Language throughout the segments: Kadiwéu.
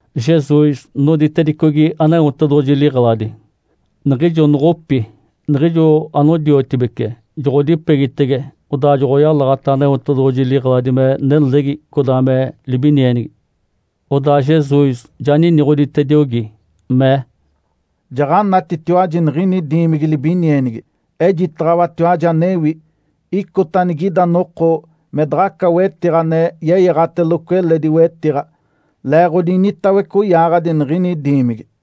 Jesus noditedicogi Aneotedoɡ̶oji liɡ̶eladi. Niɡ̶ijo noɡ̶opi, niɡ̶ijo anodiotibece joɡ̶odipegitege, odaa joɡ̶oyalaɡ̶ata Aneotedoɡ̶oji liɡ̶eladi me nelegi codaa me libinienigi. Odaa Jesus ja niniɡ̶oditediogi, mee, “Jaɡ̶anatitiwaji niɡ̶ini diimigi libinienigi. Ejitaɡ̶awatiwaji anewi. Icota anigida noko me daɡ̶aca wetiɡ̶a ane yeyaɡ̶ateloco eledi wetiɡ̶a, leeɡ̶odi initawece oyaaɡ̶adi niɡ̶ini diimigi.”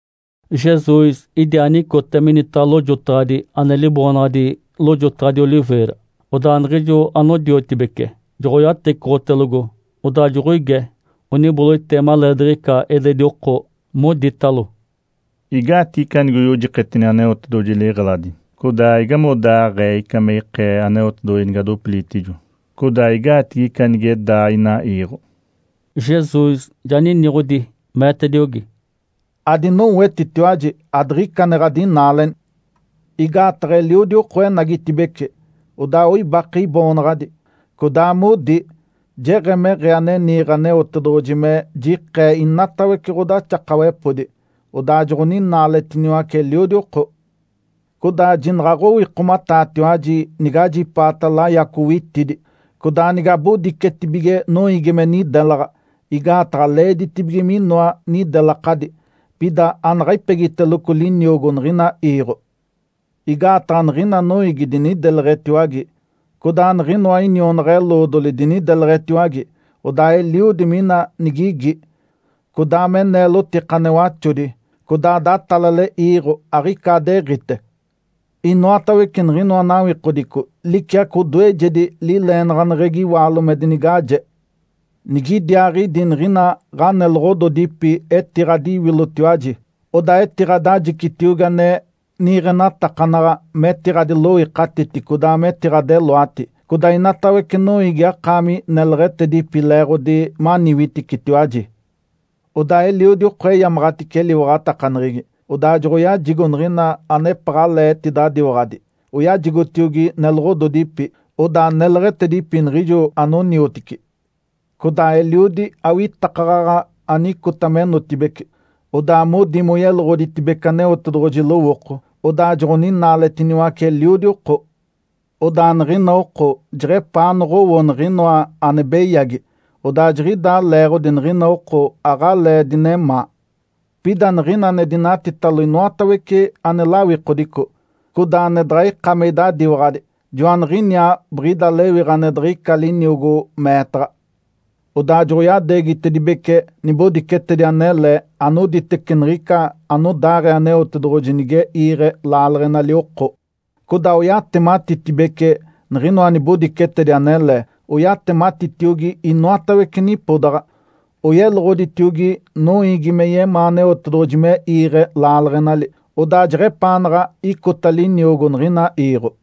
Jesus idiaa nicote minitaɡ̶a lojotaɡ̶adi ane liboonaɡ̶adi “Lojotaɡ̶adi Oliveira”. Odaa niɡ̶ijo anodiotibece joɡ̶oyatecoɡ̶otelogo, odaa joɡ̶oige, oniboloite maleediɡ̶ica eledi oko, moditalo, “Igaatigi ica nigoyojiketini Aneotedoɡ̶oji liɡ̶eladi? Codaa igamodaaɡ̶ee ica me ikee Aneotedoɡ̶oji nigadopilitijo, codaa igaatigi ica nige daa ina iiɡ̶o?” Jesus ja niniɡ̶odi, meetediogi, “Adinowetitiwaji adiɡ̶ica ane ɡ̶adinaaleni. Igaataɡ̶a eliodi oko enagitibeci, odaa oibake Iboonaɡ̶adi, codaa modi, ‘Jeɡ̶emeɡ̶ee ane niiɡ̶e Aneotedoɡ̶oji me jiɡ̶eke inatawece ɡ̶odaxakawepodi.’ Odaa joɡ̶oninaaletiniwace eliodi oko. Codaa jinaɡ̶aɡ̶owikomataatiwaji nigajipaata layaco witidi, codaa nigabodicetibige noiigi me nidelaɡ̶a. Igaataɡ̶a leeditibige minoa nidelakadi. Pida anaɡ̶a ipegiteloco liniogo niɡ̶ina iiɡ̶o. Igaataɡ̶a niɡ̶ina noiigi dinideleɡ̶etiwage, codaa niɡ̶inoa inionaɡ̶a-eloodoli dinideleɡ̶etiwage. Odaa eliodi mina nigigi, codaa me neelotika ane waxodi, codaa datalale iiɡ̶o, aɡ̶icaadeɡ̶ite. Inoatawece niɡ̶inoa nawikodico liciaco odoejedi lileenaɡ̶aneɡ̶egi iwaalo me dinigaje. Nigidiaaɡ̶idi niɡ̶ina ɡ̶aneloɡ̶ododipi etiɡ̶adiwilotiwaji, odaa etiɡ̶adajicitiogi ane niiɡ̶enatakanaɡ̶a metiɡ̶adiloikatiti codaa metiɡ̶adeloati. Codaa inatawece noiigi akaami neleɡ̶etedipi leeɡ̶odi maniwiticitiwaji. Odaa eliodi oko eyamaɡ̶atice eliwaɡ̶atakaneɡ̶egi, odaa joɡ̶oyajigo niɡ̶ina anepaɡ̶alee etidadiwaɡ̶ati, oyajigotiogi neloɡ̶ododipi, odaa neleɡ̶etedipi niɡ̶ijo anoniotici. Codaa eliodi awitakaɡ̶aɡ̶a anicota menotibeci, odaa modi moyeloɡ̶oditedibece Aneotedoɡ̶oji lowooko, odaa joɡ̶oninaaletiniwace eliodi oko. Odaa niɡ̶ina oko jeɡ̶epaa noɡ̶owo niɡ̶inoa ane beyagi, odaa jiɡ̶idaa leeɡ̶odi niɡ̶ina oko aɡ̶alee dinemaa. Pida niɡ̶ina ane dinatitalo inoatawece ane lawikodico, codaa ane daɡ̶a ika me idadiwaɡ̶adi, joaniɡ̶iniaa biɡ̶ida lewiɡ̶a ane diɡ̶ica liniogo meetaɡ̶a. Odaa joɡ̶oyadeegitedibece nibodicetedi anele anoditece niɡ̶ica anodaaɡ̶ee Aneotedoɡ̶oji nige iiɡ̶e laaleɡ̶enali oko, codaa oyatematitedibece niɡ̶inoa nibodicetedi anele. Oyatematitiogi inoatawece nipodaɡ̶a, oyeloɡ̶oditiogi noiigi me yemaa Aneotedoɡ̶oji me iiɡ̶e laaleɡ̶enali. Odaa jeɡ̶epaanaɡ̶a icota liniogo niɡ̶ina iiɡ̶o.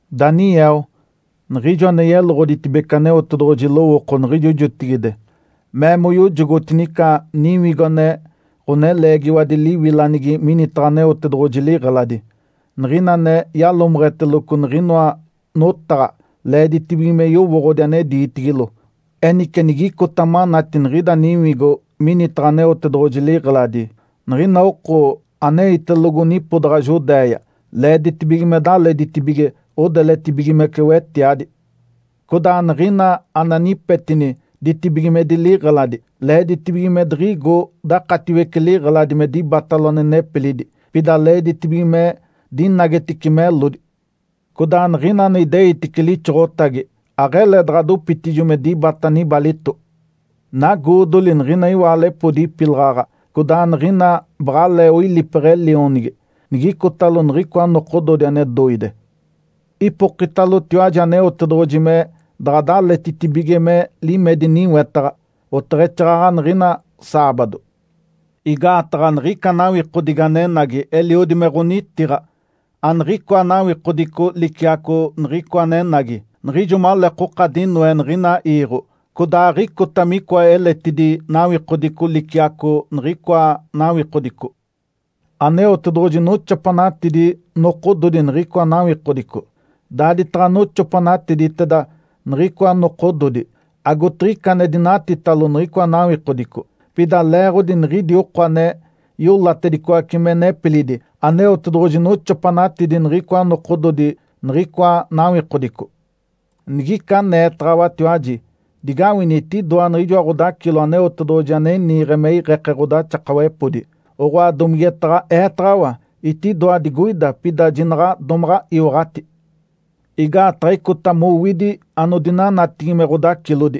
Daniel, niɡ̶ijo ane yeloɡ̶oditedibece Aneotedoɡ̶oji lowooko niɡ̶ijo jotigide, mee moyojogotini ica niwigo ane ɡ̶oneleegiwadi liwilanigi minitaɡ̶a Aneotedoɡ̶oji liɡ̶eladi. (Niɡ̶ina ane yalomeɡ̶eteloco niɡ̶inoa notaɡ̶a leeditibige me yowooɡ̶odi ane diitigilo.) Enice, nigicota manati niɡ̶ida niwigo minitaɡ̶a Aneotedoɡ̶oji liɡ̶eladi, niɡ̶ina oko aneitelogo nipodaɡ̶a Judéia, leeditibige me daleditibige, odeletibigimece wetiadi. Codaa niɡ̶ina ane anipetini ditibigimedi liɡ̶eladi, leeditibige me diɡ̶igo dakatiwece liɡ̶eladi me dibatalo ane nepilidi, pida leeditibige me dinagetice melodi. Codaa niɡ̶ina ane ideitice lixoɡ̶otagi, aɡ̶ele daɡ̶a dopitijo me dibata nibalito. Nagoodoli niɡ̶ina iwaalepodi ipilaɡ̶aɡ̶a codaa niɡ̶ina baɡ̶alee oilipeɡ̶e lionigi nigicotalo niɡ̶icoa nokododi ane doide! Ipokitalotiwaji Aneotedoɡ̶oji me daɡ̶adaletitibige me limedi niwetaɡ̶a, oteɡ̶exaaɡ̶aɡ̶a niɡ̶ina saabado. Igaataɡ̶a niɡ̶ica nawikodigi anenagi eliodi me ɡ̶onitiɡ̶a. Aniɡ̶icoa nawikodico liciaco niɡ̶icoa anenagi, niɡ̶ijo maleekoka dinoe niɡ̶ina iiɡ̶o. Codaa aɡ̶icota micoa eletidi nawikodico liciaco niɡ̶icoa nawikodico. Aneotedoɡ̶oji noxopanatidi nokododi niɡ̶icoa nawikodico. Daaditaɡ̶a noxopanatiditeda niɡ̶icoa nokododi, agotiɡ̶ica ane dinatitalo niɡ̶icoa nawikodico. Pida leeɡ̶odi niɡ̶idi oko ane iolatedicoace me nepilidi, Aneotedoɡ̶oji noxopanatidi niɡ̶icoa nokododi niɡ̶icoa nawikodico. Nigica aneetaɡ̶awatiwaji, ‘Digawini, etidoa niɡ̶ijoa ɡ̶odacilo Aneotedoɡ̶oji ane niiɡ̶e me iɡ̶eke ɡ̶odaxakawepodi!’, oɡ̶oa, domigetaɡ̶a eetaɡ̶awa, ‘Etidoa digoida!’ Pida jinaɡ̶a domaɡ̶a iwaɡ̶ati. Igaataɡ̶a icota mowidi anodinanatigi me ɡ̶odacilodi,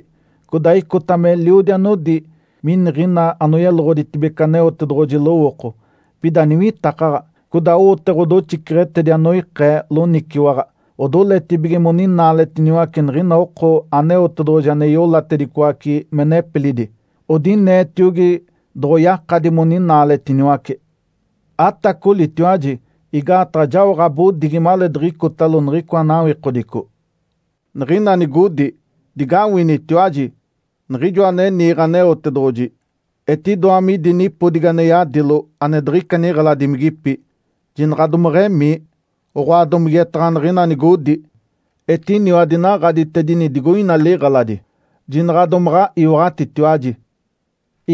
codaa icota meliodi anodi miniɡ̶ina anoyeloɡ̶oditedibece Aneotedoɡ̶oji lowooko, pida niwitakaɡ̶a. Codaa owote ɡ̶odoxiceɡ̶etedi anoikee loniciwaɡ̶a, odoletibige moninaaletiniwace niɡ̶ina oko Aneotedoɡ̶oji ane iolatedicoace me nepilidi, odineetiogi doɡ̶oyakadi moninaaletiniwace. Atacolitiwaji! Igaataɡ̶a jao ɡ̶abodigi maleediɡ̶icotalo niɡ̶icoa nawikodico. Niɡ̶ina nigodi, ‘Digawinitiwaji! Niɡ̶ijoa ane niiɡ̶e Aneotedoɡ̶oji etidoa midi nipodigi ane yadilo ane diɡ̶ica niɡ̶eladimigipi.’ Jinaɡ̶a domeɡ̶emii! Oɡ̶oa, domigetaɡ̶a niɡ̶ina nigodi, ‘Etiniwa dinaɡ̶aditedini digoina liɡ̶eladi’, jinaɡ̶a domaɡ̶a iwaɡ̶atitiwaji.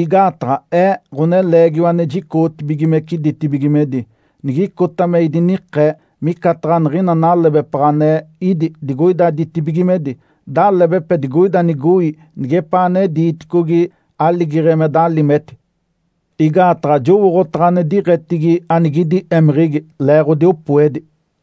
Igaataɡ̶a Ee, Ǥoneleegiwa ane jicoɡ̶otibigimece ditibigimedi, nigicota me idinikee, micataɡ̶a niɡ̶ina nalebepaɡ̶a ane ídi digoida ditibigimedi, dalebepe digoida nigoi nigepaa ane diiticogi aligeɡ̶e me dalimeti. Igaataɡ̶a jowooɡ̶otaɡ̶a ane diɡ̶etigi anigidi émeɡ̶egi, leeɡ̶odi opoedi.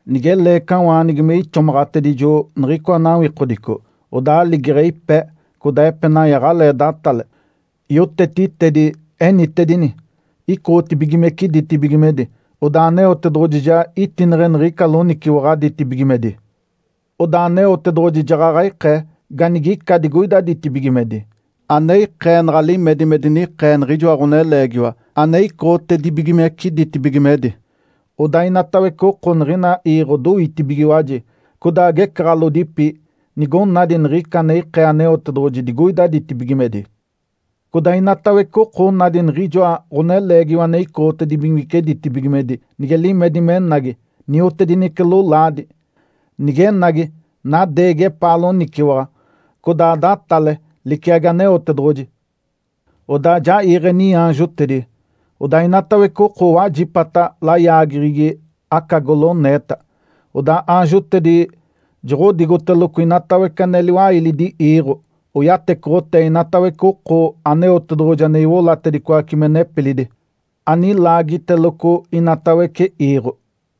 Nige leecawaanigi me ixomaɡ̶atedijo niɡ̶icoa nawikodico, odaa aligeɡ̶e ipe, codaa epenai aɡ̶alee datale. Yotetitedi enitedini, icoɡ̶otedibigimece ditibigimedi, odaa Aneotedoɡ̶oji ja itineɡ̶e niɡ̶ica loniciwaɡ̶a ditibigimedi. Odaa Aneotedoɡ̶oji jaɡ̶aɡ̶a ikee ganigica digoida ditibigimedi, ane ikee naɡ̶a limedi me dinikee niɡ̶ijoa Ǥoneleegiwa ane icoɡ̶otedibigimece ditibigimedi. Odaa inatawece oko niɡ̶ina iiɡ̶o doitibigiwaji, codaa agecaɡ̶alodipi nigonadi niɡ̶ica ane ikee Aneotedoɡ̶oji digoida ditibigimedi. Codaa inatawece oko onadi niɡ̶ijoa Ǥoneleegiwa ane icoɡ̶otedibigimece ditibigimedi nige limedi menagi, niotedinece lolaadi. Nigenagi, nadeegi epaa loniciwaɡ̶a, codaa datale liciagi Aneotedoɡ̶oji. Odaa ja iiɡ̶e niaanjotedi, odaa inatawece oko owajipata layaageɡ̶egi aca goloneeta. Odaa aanjotedi joɡ̶odigoteloco inoatawece ane liwailidi iiɡ̶o, oyatecoɡ̶otee inatawece oko Aneotedoɡ̶oji ane iolatedicoace me nepilidi, anilaagiteloco inatawece iiɡ̶o.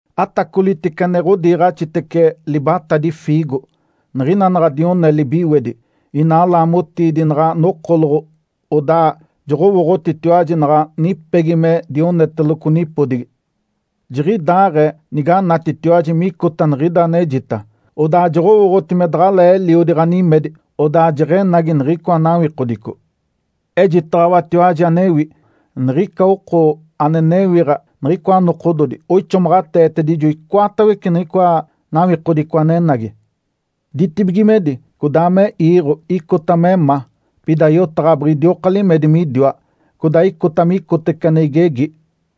Atacolitece ane ɡ̶odiiɡ̶axitece libatadi fiigo. Niɡ̶ina naɡ̶a dione libiwedi, ina laamotiidi naɡ̶a nokoloɡ̶o, odaa joɡ̶owooɡ̶otitiwaji naɡ̶a nipegi me dioneteloco nipodigi. Jiɡ̶idaaɡ̶ee niganatitiwaji micota niɡ̶ida anejita, odaa joɡ̶owooɡ̶oti me daɡ̶alee eliodi ɡ̶animedi, odaa jeɡ̶enagi niɡ̶icoa nawikodico. Ejitaɡ̶awatiwaji anewi. Niɡ̶ica oko ane newiɡ̶a niɡ̶icoa nokododi oixomaɡ̶ateetedijo icoatawece niɡ̶icoa nawikodico anenagi. Ditibigimedi codaa me iiɡ̶o icota me ma, pida yotaɡ̶a biɡ̶idioka limedi midiwa, codaa icota micotece ane igegi.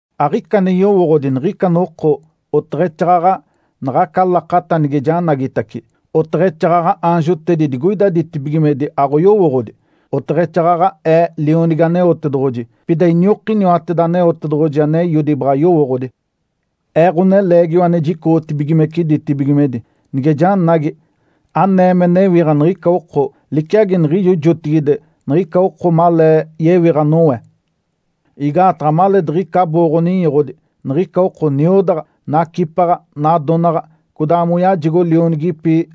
Aɡ̶ica ane yowooɡ̶odi niɡ̶ica noko oteɡ̶exaaɡ̶aɡ̶a naɡ̶aca lakata nige janagitace. Oteɡ̶exaaɡ̶aɡ̶a aanjotedi digoida ditibigimedi aɡ̶oyowooɡ̶odi, oteɡ̶exaaɡ̶aɡ̶a Ee, Lionigi Aneotedoɡ̶oji. Pida iniokiniwateda Aneotedoɡ̶oji ane Eiodi baɡ̶a yowooɡ̶odi. Ee, Ǥoneleegiwa ane jicoɡ̶otibigimece ditibigimedi, nige janagi, anee me newiɡ̶a niɡ̶ica oko liciagi niɡ̶ijo jotigide niɡ̶ica oko malee yewiɡ̶a Noé. Igaataɡ̶a maleediɡ̶ica abooɡ̶o-ninyoɡ̶odi niɡ̶ica oko niodaɡ̶a, nacipaɡ̶a, nadonaɡ̶a, codaa moyajigo lionigipi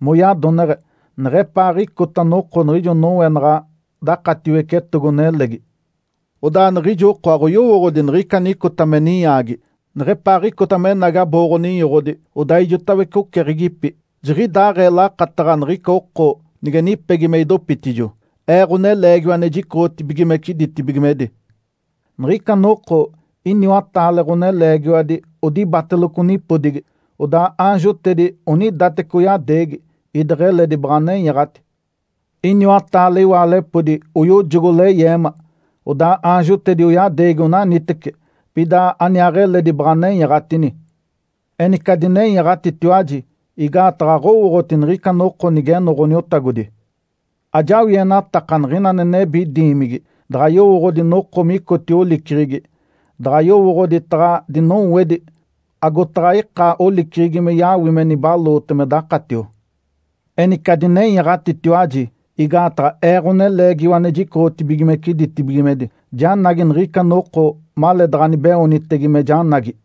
moyadoneɡ̶e neɡ̶epaaɡ̶icota noko niɡ̶ijo Noé naɡ̶a dakatiwece etogo-nelegi. Odaa niɡ̶ijo oko aɡ̶oyowooɡ̶odi niɡ̶ica anicota me ninyaagi, neɡ̶epaaɡ̶icota menagi abooɡ̶o-ninyoɡ̶odi, odaa ijotawece oceɡ̶egipi. Jiɡ̶idaaɡ̶ee lakataɡ̶a niɡ̶ica oko nige nipegi me idopitijo, Ee, Ǥoneleegiwa ane jicoɡ̶otibigimece ditibigimedi. Niɡ̶ica noko iniwataale ɡ̶oneleegiwadi odibateloco nipodigi. Odaa aanjotedi onidateci oyadeegi, ideɡ̶eledi baɡ̶a nenyaɡ̶ati. Iniwataale iwaalepodi oyojogo leyeema. Odaa aanjotedi oyadeegi onaniteci, pida aniaaɡ̶eledi baɡ̶a nenyaɡ̶atini. Enice adinenyaɡ̶atitiwaji! Igaataɡ̶a aɡ̶owooɡ̶oti niɡ̶ica noko nigeno Ǥaniotagodi. Ajawienatakanaɡ̶a niɡ̶ina ane nebi diimigi daɡ̶a yowooɡ̶odi noko micotio oliceɡ̶egi, daɡ̶a yowooɡ̶odi taɡ̶a dinowedi agotaɡ̶a ika oliceɡ̶egi me yawime nibaloote me dakatio. Enice adinenyaɡ̶atitiwaji! Igaataɡ̶a Ee, Ǥoneleegiwa ane jicoɡ̶otibigimece ditibigimedi, janagi niɡ̶ica noko maleedaɡ̶anibeoonitege me janagi.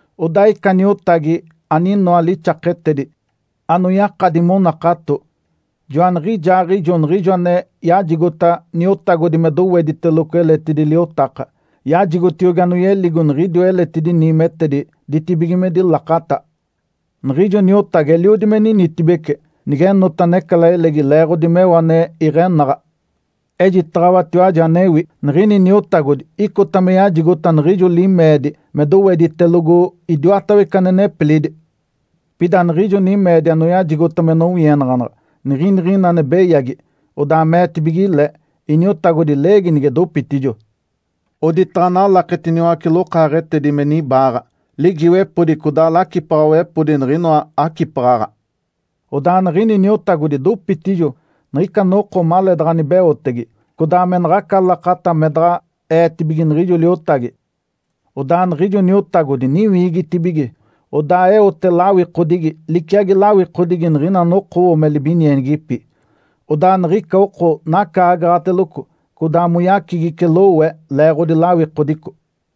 Odaa ica niotagi aninoa lixaketedi, anoyakadi monakato, joaniɡ̶ijaaɡ̶ijo niɡ̶ijo ane yajigota niotagodi me dowediteloco eletidi liotaka. Yajigotiogi anoyeligo niɡ̶idiwa eletidi niimetedi ditibigimedi lakata. Niɡ̶ijo niotagi eliodi me ninitibece nigenota necalailegi leeɡ̶odi meo ane iɡ̶enaɡ̶a. Ejitaɡ̶awatiwaji anewi. Niɡ̶ini niotagodi icota me yajigota niɡ̶ijo limeedi me doweditelogo idiwatawece ane nepilidi. Pida niɡ̶ijo nimeedi anoyajigota me nowienaɡ̶anaɡ̶a niginiɡ̶ina ane beyagi, odaa meetibige le, ‘Iniotagodi leegi nige dopitijo.’ Oditaɡ̶a nalaketiniwace lokaaɡ̶etedi me niba, ligiiwepodi codaa lacipaɡ̶awepodi niɡ̶inoa acipaɡ̶aɡ̶a. Odaa niɡ̶ini niotagodi dopitijo niɡ̶ica noko maleedaɡ̶a nibeotege, codaa me naɡ̶aca lakata me daɡ̶a eetibige niɡ̶ijo liotagi. Odaa niɡ̶ijo niotagodi niwiigitibige, odaa eote lawikodigi liciagi lawikodigi niɡ̶ina anokowo me libinienigipi. Odaa niɡ̶ica oko nacaagaɡ̶ateloco codaa moyacigice lowe leeɡ̶odi lawikodico.